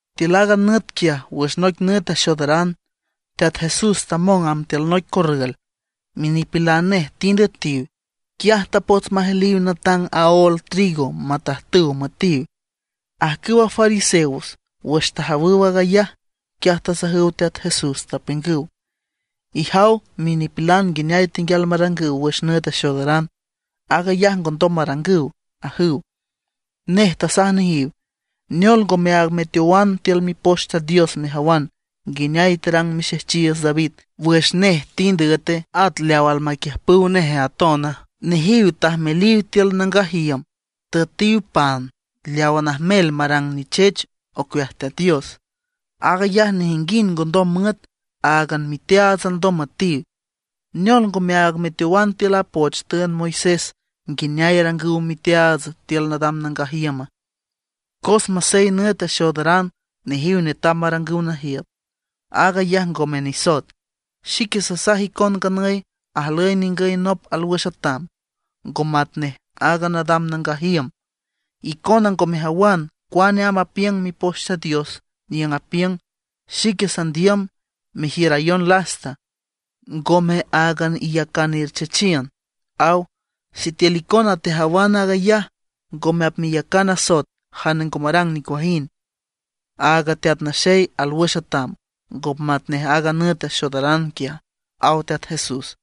Tiül aaga nüt quiaj wüx noic nüt axoodaran, Teat Jesús tamong amb tiül noic corrül. Minipilan nej tind üetiw, quiaj tapots majeliw natang aól trigo matajtüw müetiw. Ajcüwa fariseos wüx tajawüw aag ayaj, quiaj tasajüw Teat Jesús, tapiüngüw: ―Ijaw minipilan nguineay tenguial marangüw wüx nüt axoodaran, aag ayaj ngondom marangüw ―ajüw. Nej tasaj nejiw: ―¿Neol ngomeaag meteowana tiül Mipoch Teat Dios mejawan nguineay tarang mixejchiiüts David wüx nej tind üete, at leaw almaquiüjpüw nej atona? Nejiw tajmeliw tiül nangaj iüm, tüetiw pan leawa najmel marang nichech ocueaj Teat Dios; aag ayaj nejinguind ngondom müet, áagan miteaats alndom müetiw. ¿Neol ngomeaag meteowan tiül a poch tüünd Moisés nguineay arangüw miteaats tiül nadam nangaj iüma? Cos masey nüt axoodaran nejiw netam marangüw najiüt, aag ayaj ngome nisoet. Xique sasaj icon nganüy ajlüy ningüy nop alwüx atam, ngo matnej aaga nadam nangaj iüm. Icona ngo mejawan cuane amb apiüng Mipoch Teat Dios niüng apiüng: “Xique sandiüm mejiürayon lasta, ngome áagan iyacan erchechiün”, aw. Sitiül icona tejawan aag ayaj, ngome apmeyacan asoet jane ngo marang nicuajind. Aaga Teat Naxey alwüx atam, ngo matnej aaga nüt axoodaran quiaj ―aw Teat Jesús.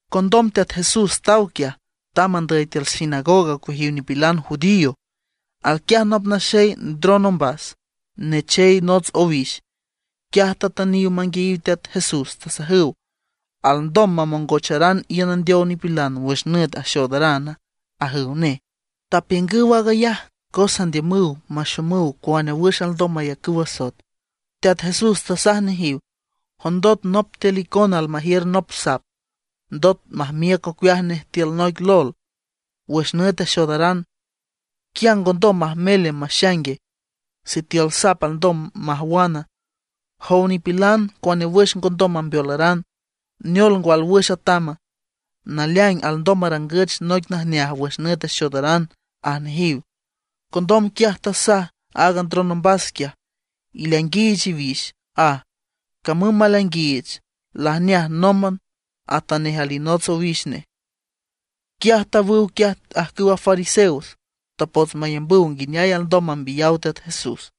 Condom Teat Jesús taw quiaj, tamb andüy tiül sinagoga ocueaj nipilan judío. Alquiaj nop naxey ndron ombas, nechey nots owix. Quiaj tatüniw manguiayiw Teat Jesús, tasajüw: ―¿Alndom mamongocharan iün andeow nipilan wüx nüt axoodarana? ―ajüw nej. Tapiüngüw aag ayaj cos andiümüw maxomüw cuane wüx alndom mayacüw asoet. Teat Jesús tasaj nejiw: ―Jondot nop tiül icona almajiür nop sap, ndot majmiüc ocueaj nej tiül noic lol wüx nüt axoodaran, ¿quia ngondom majmele maxaingue? Sitiül sap alndom majwan, jow nipilan, cuane wüx ngondom mambeolaran. ¿Neol ngwa alwüx atama? Naleaing alndom marangüch noic najneaj wüx nüt axoodaran ―aj nejiw. Condom quiaj tasaj aaga ndron ombas quiaj: ―Ileainguiich iwix ―aj. Camüm maleainguiich, lajneaj nómban atanej alinots owix nej. Quiaj tawüw quiaj ajcüwa fariseos. Tapots mayambüw nguineay alndom mambiyaw Teat Jesús.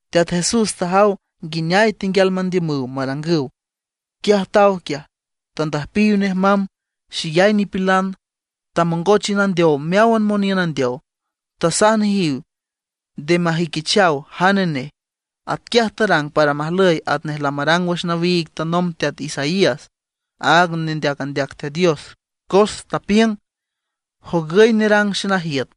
Teat Jesús tajaw nguineay tenguial mandiümüw marangüw. Quiaj taw quiaj, tandüjpiw nej mamb xeyay nipilan. Tamongoch iün andeow meáwan moniün andeow. Tasaj nejiw nde majüiquichaw jane nej. Atquiaj tarang para majlüy atnej lamarang wüx nawiig tanomb teat Isaías, áag nendeac andeac Teat Dios, cos tapiüng: Jogüy nerang xenajiüt,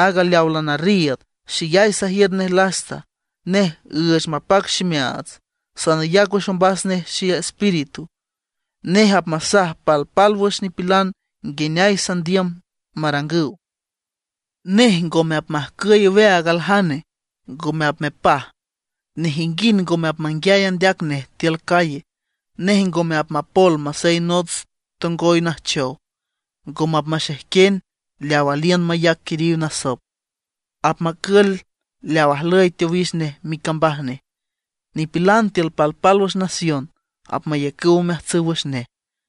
áag leawa lanarriiüd, xeyay sajiür nej lasta, nej üüch mapac ximeaats. Sanayac wüx ombas nej xeespíritu; nej apmasaj palpálwüx nipilan nguineay sandiüm marangüw. Nej ngome apmajcüy aweaag aljane, ngome apmepaj. Nejinguind ngome apmanguiay andeac nej tiül calle. Nej ngome apmapol masey nots tongoy najchow, ngome apmaxejquen leaw aliün mayac quiriw nasop; apmacül leaw ajlüy teowix nej micambaj nej. Nipilan tiül palpálwüx nación apmayacüw omeajtsüw wüx nej.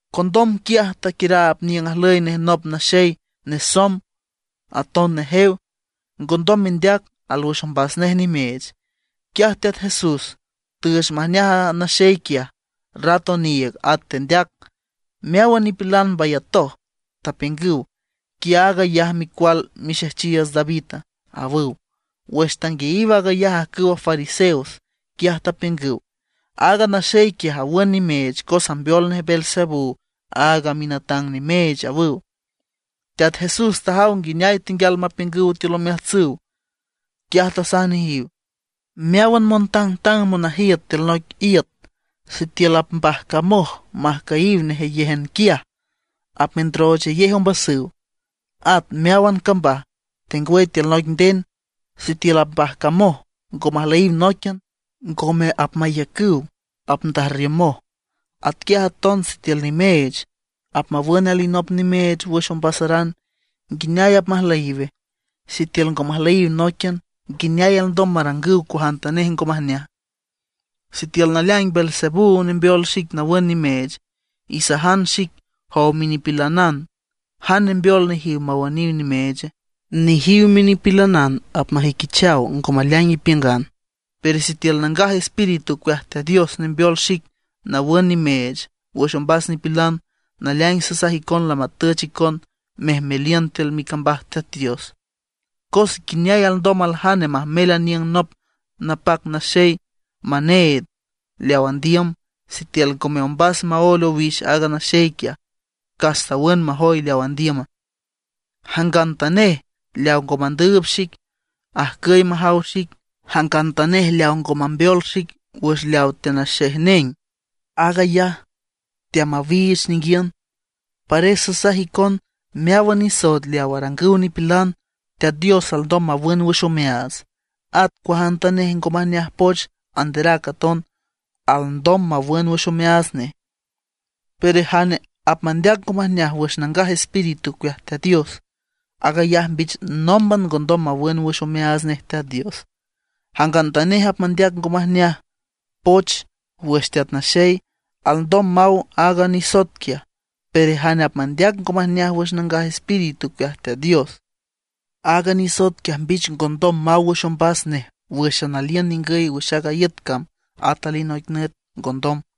Condom quiaj taquiüraab niüng ajlüy nej nop naxey nesomb, aton nejew, ngondom mendeac, alwüx ombas nej nimeech. Quiaj Teat Jesús tüüch majneaj a naxey quiaj, rat oniiüg at tendeac. Meáwan nipilan mbayatoj, tapiüngüw: ―¿Quia aag ayaj micual mixejchiiüts Davida? ―awüw. Wüx tanguiayiw aag ayaj ajcüwa fariseos, quiaj tapiüngüw: ―Aaga naxey quiaj awün nimeech cos ambeol nej Beelzebú, aaga minatang nimeech ―awüw. Teat Jesús tajaw nguineay tenguial mapiüngüw tiül omeajtsüw, quiaj tasaj nejiw: ―Meáwan montangtang monajiüt tiül noic iüt, sitiül apmbajcamoj majcüyiw nejeyéjan quiaj, apmendroochayej ombasüw. At meáwan cambaj, tengwüy tiül noic nden, sitiül mbajcamoj ngo majlüyiw nóiquian, ngome apmaiücüw, apndajrriümoj. Atquiaj aton sitiül nimeech apmawün alinop nimeech wüx ombasaran, ¿nguineay apmajlüyiwe? Sitiül ngo majlüyiw nóiquian, ¿nguineay alndom marangüw cuajantanej ngo majneaja? Sitiül naleaing Beelzebú nembeol xic nawün nimeech, isajan xic, jow minipilanan, ¿jane nembeol nejiw mawüniw nimeeche? Nejiw minipilanan apmajüiquichaw ngo maleaing ipiüngan. Pero sitiül Nangaj Espíritu ocueaj Teat Dios nembeol xic nawün nimeech wüx ombas nipilan, naleaing sasaj icon lamatüch icon mejmeliün tiül micambaj Teat Dios. ’¿Cos nguineay alndom aljane majmel aniüng nop napac naxey maneed leaw andiüm, sitiül ngome ombas maóel owix aaga naxey quiaj, cas tawün majoy leaw andiüma? ’Jangantanej leaw ngo mandüüb xic, ajcüy majaw xic. Jangantanej leaw ngo mambeol xic wüx leaw teanaxejneng, aag ayaj teamawiich ninguiün. ’Pares sasaj icon, meáwan nisoet leaw arangüw nipilan, Teat Dios alndom mawün wüx omeaats. At cuajantanej ngo majneaj poch anderac aton alndom mawün wüx omeaats nej. Pero jane apmandeac ngo majneaj wüx Nangaj Espíritu ocueaj Teat Dios, aag ayaj mbich nómban ngondom mawün wüx omeaats nej Teat Dios. Jangantanej apmandeac ngo majneaj poch wüx Teat Naxey, alndom maw aaga nisoet quiaj; pero jane apmandeac ngo majneaj wüx Nangaj Espíritu ocueaj Teat Dios, aaga nisoet quiaj mbich ngondom maw wüx ombas nej wüx aliün ningüy wüx aaga iüt cam, at alinoic nüt ngondom.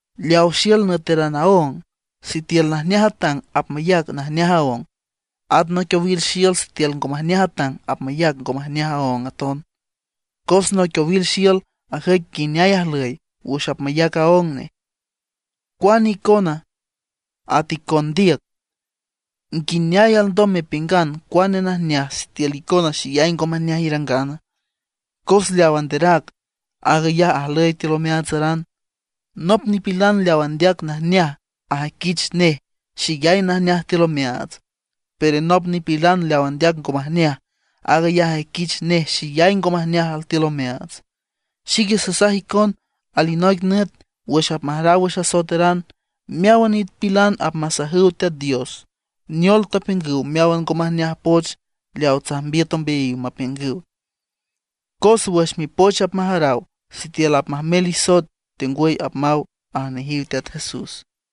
’Leaw xiül nüeteran aóng, sitiül najneaj atang, apmayac najneaj aóng. At noic owil xiül sitiül ngo majneaj atang apmayac ngo majneaj aóng aton. Cos noic owil xiül ajüic nguineay ajlüy wüx apmayac aóng nej. ¡Cuane icona, at icon ndiüc! ¿Nguineay alndom mepiüngan cuane najneaj, sitiül icona xeyay ngo majneaj irangana? Cos leaw anderac, aag ayaj ajlüy tiül omeaatsaran. Nop nipilan leaw andeac najneaj ajüiquich nej xeyay najneaj altiül omeaats. Pero nop nipilan leaw andeac ngo majneaj, aag ayaj ajüiquich nej xeyay ngo majneaj altiül omeaats. Xique sasaj icon, alinoic nüt wüx apmajaraw wüx asoeteran, meáwan nipilan apmasajüw Teat Dios neol tapiüngüw meáwan ngo majneaj poch leaw tsajmbiüt ombeayiw mapiüngüw. Cos wüx mipoch apmajaraw sitiül apmajmel isoet tengwüy apmaw ―aj nejiw Teat Jesús.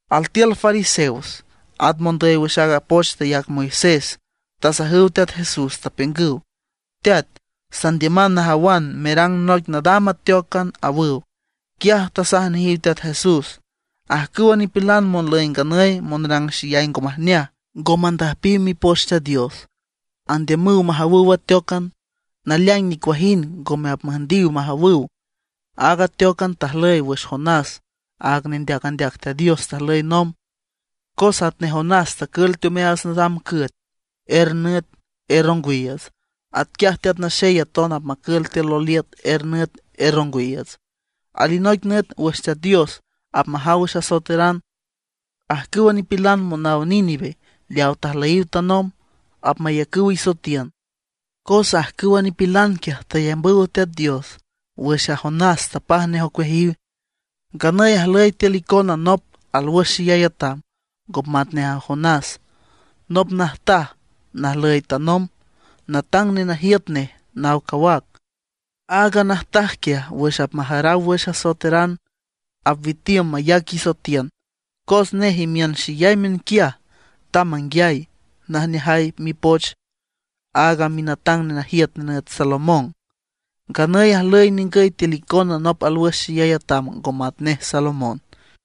Altiül fariseos, at mondüy wüx aaga poch tayac Moisés tasajüw Teat Jesús, tapiüngüw: ―Teat, sandiüman najawan merang noic nadam ateócan ―awüw. Quiaj tasaj nejiw Teat Jesús: ―Ajcüwa nipilan monlüy nganüy monrang xeyay ngo majneaj, ngo mandüjpiw Mipoch Teat Dios, andiümüw majawüw ateócan. Naleaing nicuajind ngome apmüjndiw majawüw, áagan ateócan tajlüy wüx Jonás aaga nendeac andeac Teat Dios tajlüy nomb. Cos atnej Jonás tacül teomeaats nadam cüet er nüt er ongwiiüts, atquiaj Teat Naxey aton apmacül tiül loliüt er nüt er ongwiiüts. Alinoic nüt wüx Teat Dios apmajaw wüx asoeteran, ajcüwa nipilan monaw Nínive leaw tajlüyiw tanomb, apmayacüw isoetiün. Cos ajcüwa nipilan quiaj tayambüw Teat Dios wüx a Jonás tapaj nej ocueajiw. Nganüy ajlüy tiül icona nop alwüx xeyay atam ngo matnej a Jonás. Nop najtaj najlüy tanomb, natang nenajiüt nej naw cawac. Aaga najtaj quiaj wüx apmajaraw wüx asoeteran apwitiüm mayac isoetiün; cos nej imiün xeyay miünquiaj tamb manguiay najneajay mipoch aaga minatang nenajiüt nenüt Salomón. Nganüy ajlüy ningüy tiül icona nop alwüx xeyay atam ngo matnej Salomón.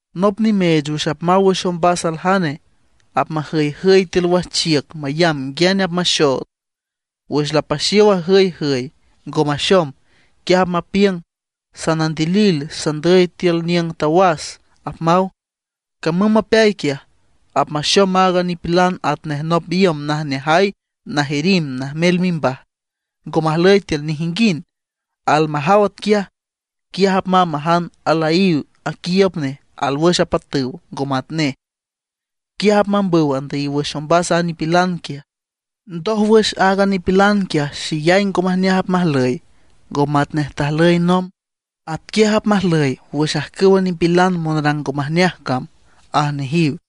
’Nop nimeech wüx apmaw wüx ombas aljane, apmajüyjüy tiül wajchiüc mayamb nguiane apmaxood. Wüx lapaxiow ajüyjüy, ngo maxom, quiaj apmapiüng: “Sanandilil, sandüy tiül niüng tawas”, apmaw. Camüm mapeay quiaj, apmaxom aaga nipilan atnej nop iüm najneajay najirimb najmel mimbaj, ngo majlüy tiül nejinguind. Almajaw atquiaj, quiaj apmamb majan alayaíw aquiiüb nej alwüx apatüw, ngo matnej. Quiaj apmambüw andüyiw wüx ombas a nipilan quiaj. Ndójwüx aaga nipilan quiaj xeyay ngo majneaj apmajlüy, ngo matnej tajlüy nomb. Atquiaj apmajlüy wüx ajcüwa nipilan monrang ngo majneaj cam ―aj nejiw.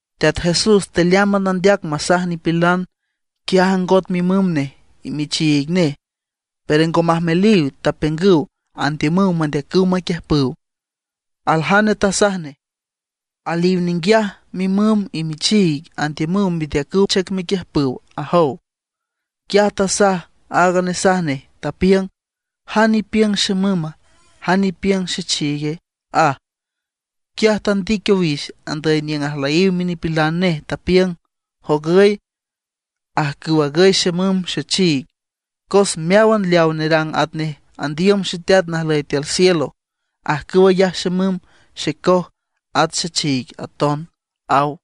Teat Jesús tealeámban andeac masaj nipilan, quiaj ajngot mimüm nej y michiig nej, pero ngo majmeliw. Tapiüngüw andiümüw mandeacüw maquiüjpüw. Aljane tasaj nej: ―Aliw ninguiaj mimüm y michiig. Andiümüw mendeacüw chüc mequiüjpüw ―ajow. Quiaj tasaj aaga nesaj nej, tapiüng: ―¿Jane ipiüng xemüma, jane ipiüng xechiigue? ―aj. Quiaj tandic owix andüy niüng ajlüyiw minipilan nej, tapiüng: ―Jogüy ajcüw agüy xemüm, xechiig. Cos meáwan leawa nerang atnej andiüm Xeteat najlüy tiül cielo, ajcüw ayaj xemüm, xecoj, at xechiig aton ―aw.